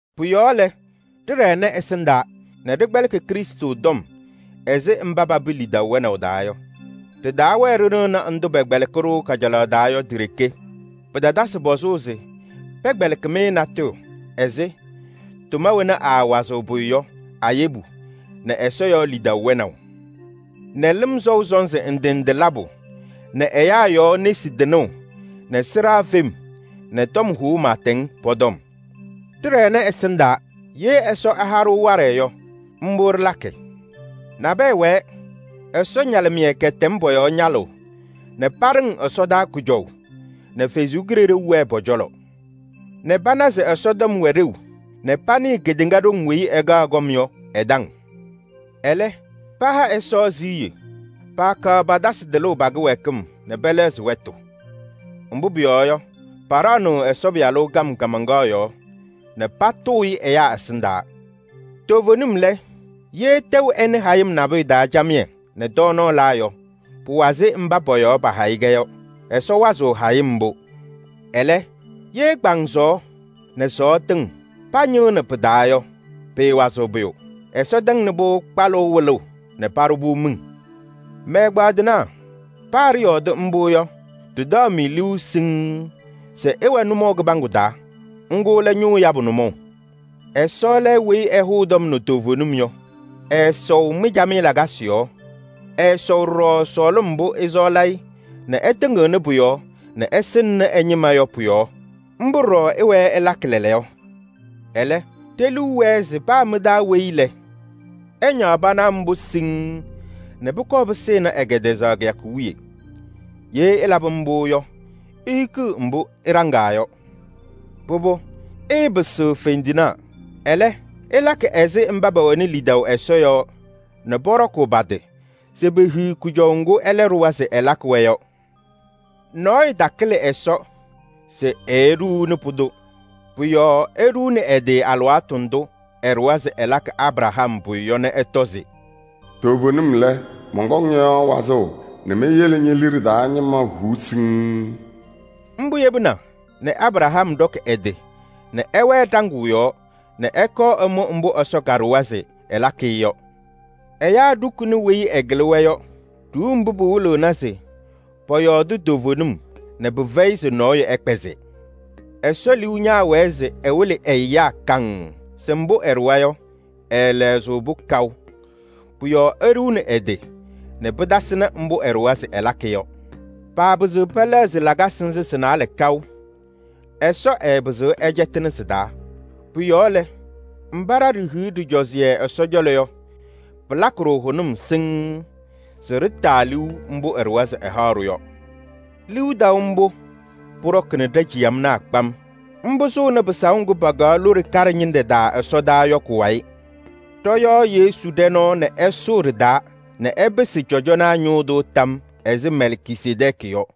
Pʋ-yɔɔ lɛ, ɖɩɖɛnɩ ɛsɩndaa nɛ ɖɩkpɛlɩkɩ Krɩstʋ tɔm ɛzɩ mba papɩ lidaʋ wɛnaʋ taa yɔ. Ɖɩtaawɛɛ ɖɩnɩɣnɩ ndʋ pɛkpɛlɩkɩ-ɖʋ kajalaɣ taa yɔ ti-ɖeke. Pɩtatasɩ pɔzʋʋ se pɛkpɛlɩkɩ-mɩ natʋyʋ ɛzɩ: tʋma wena aawazɩɣ pʋyʋ yɔ a-yebu nɛ Ɛsɔ yɔɔ lidaʋ wɛnaʋ nɛ lɩm sɔʋ sɔnzɩ ndɩ ndɩ labʋ nɛ ɛyaa yɔɔ nesi tɩnʋʋ nɛ sɩɖaa fem nɛ tɔm hʋʋ pɩɩtɛŋ, pɔ-tɔm. Ɖɩɖɛnɩ ɛsɩndaa! Ye Ɛsɔ ɛha-ɖʋ waɖɛ yɔ, mbʋ ɖɩlakɩ. Nabɛyɛ wɛɛ, Ɛsɔ ñalɩmɩyɛ kɛtɛm pɔ-yɔɔ ñalʋʋ nɛ paɖɩŋ ɛsɔdaa kʋjɔʋ nɛ Ɛsɔ Kalɩzaɣ wɛɛ pɔ-cɔlɔ nɛ pana se Ɛsɔtɔm wɛ ɖeu nɛ panɩɩ kedeŋa ɖoŋ weyi ɛkaɣ kɔm yɔ ɛ-taŋ. Ɛlɛ, paha Ɛsɔ siɣye. Paakaɣ patasɩ tɩlʋʋ pa-kɩwɛɛkɩm nɛ pɛlɛɣzɩ wɛtʋ. Mbʋ pʋyɔɔ yɔ, paɖaɣnɩɣ Ɛsɔ Pɩyalʋ kam kaamaŋkaɣ yɔɔ nɛ patʋʋ-ɩ ɛyaa ɛsɩndaa. Toovenim lɛ, ye tɛʋ ɛnɩ hayɩm nabʋyʋ taa camɩyɛ nɛ tɔɔnaɣ la yɔ, pʋwazɩ mba pɔ-yɔɔ pahayɩ-kɛ yɔ. Ɛsɔ wazɩɣ hayɩm mbʋ pʋ-yɔɔ. Ɛlɛ, ye kpaŋsɔɔ nɛ sɔɔ tɩŋ pañɩɣnɩ pɩ-taa yɔ, pɩɩwazɩɣ pʋyʋ. Ɛsɔ tɛŋnɩ-pʋ kpalʋʋ wɩlʋʋ nɛ paɖʋ-pʋ miŋ. Mɛ-ɛgbaadɩnaa! Paa ɖɩyɔɔdɩ mbʋ yɔ, ɖɩtaɣ-mɩ liu siŋŋ se ɩwɛ nʋmɔʋ kɩbaŋgʋ taa, ŋgʋ lɛ ñʋʋ yabʋ nʋmɔʋ. Ɛsɔ lɛ weyi ɛhʋʋ tɔm nɛ toovenim yɔ. Ɛɛsɔʋ mɩ-camɩyɛ lakasɩ yɔɔ. Ɛɛsɔʋ ɖɔɖɔ sɔɔlɩm mbʋ ɩsɔɔlɩ-ɩ nɛ ɩtɩŋɩɣnɩ pʋ-yɔɔ nɛ ɩsɩŋnɩ ɛ-ñɩma yɔ pʋyɔɔ. Mbʋ ɖɔɖɔ ɩwɛɛ ɩlakɩ lɛɛlɛɛyɔ. Ɛlɛ, ɖe-liu wɛɛ se paa mɩ-taa weyi lɛ, ɛñaɣ pana mbʋ siŋŋ nɛ pʋkɔɔ pɩsɩnɩ ɛ-kɛtɛzaɣ kɩyakʋ wiye. Ye ɩlabɩ mbʋ yɔ, ihikiɣ mbʋ ɩɖaŋaa yɔ. Pʋbʋ, ɩɩpɩsɩɣ fendinaa. Ɛlɛ, ɩlakɩ ɛzɩ mba pɛwɛnɩ lidaʋ Ɛsɔ yɔɔ nɛ pɔɖɔkʋʋ pa-tɩ se pehiɣ kʋjɔʋ ŋgʋ ɛlɛ ɖʋwa se ɛlakɩ-wɛ yɔ. Nɔɔyʋ takɩlɩ Ɛsɔ se eeɖuuni pʋdʋ. Pʋ-yɔɔ eɖuuni ɛ-tɩ alɩwaatʋ ndʋ ɛɖʋwa se ɛlakɩ Abraham pʋyʋ yɔ nɛ ɛtɔ se: “Toovenim lɛ, mɔnkɔŋ ñɔ-yɔɔ wazʋʋ nɛ meyele ñe-liɖe taa ñɩma huu siŋŋ.” Mbʋ yebina nɛ Abraham ɖɔkɩ ɛ-tɩ nɛ ɛwɛɛ ɖaŋʋʋ yɔɔ nɛ ɛkɔɔ ɛmʋ mbʋ Ɛsɔ kaɖʋwa se ɛlakɩ-ɩ yɔ. Ɛyaa ɖukuni weyi ɛkɩlɩ-wɛ yɔ. Ɖuuu mbʋ pɩwɩlɩɣnɩ se pɔyɔɔdɩ toovenim nɛ pɩfɛyɩ se nɔɔyʋ ɛkpɛzɩ. Ɛsɔ liu ñaawɛɛ se ɛwɩlɩ ɛ-ɛyaa kaŋŋ se mbʋ ɛɖʋwa yɔ, ɛɛlɛɣzɩ-pʋ kaʋ. Pʋ-yɔɔ eɖuuni ɛ-tɩ nɛ pɩtasɩnɩ mbʋ ɛɖʋwa se ɛlakɩ yɔ. Lakasɩ nzɩ sɩ-naalɛ sɩɩlɛɣzɩɣ kaʋ. Ɛsɔ ɛɛpɩzɩɣ ɛcɛtɩnɩ sɩ-taa. Pʋ-yɔɔ lɛ, mba ɖa ɖihiɣ ɖɩcɔzɩyɛ Ɛsɔ cɔlɔ yɔ, pɩlakɩ-ɖʋ hʋnʋm siŋŋ se ɖɩtaa liu mbʋ ɛɖʋwa se ɛhaɣ-ɖʋ yɔ. Liu taʋ mbʋ pʋɖɔkɩnɩ ɖa-ciyamnaa kpam. Mbʋ sʋʋnɩ pɩsaʋ ŋgʋ pakaɣ lone kaɖɛ ñɩnɖɛ taa ɛsɔdaa yɔ kʋ-wayɩ. Ɖɔ-yɔɔ Yesu ɖɛ nɔɔ nɛ ɛsʋʋ ɖɩ-taa nɛ ɛpɩsɩ cɔjɔnaa ñʋʋ tʋ tam yɔɔ ɛzɩ Mɛlkisedɛɛkɩ yɔ.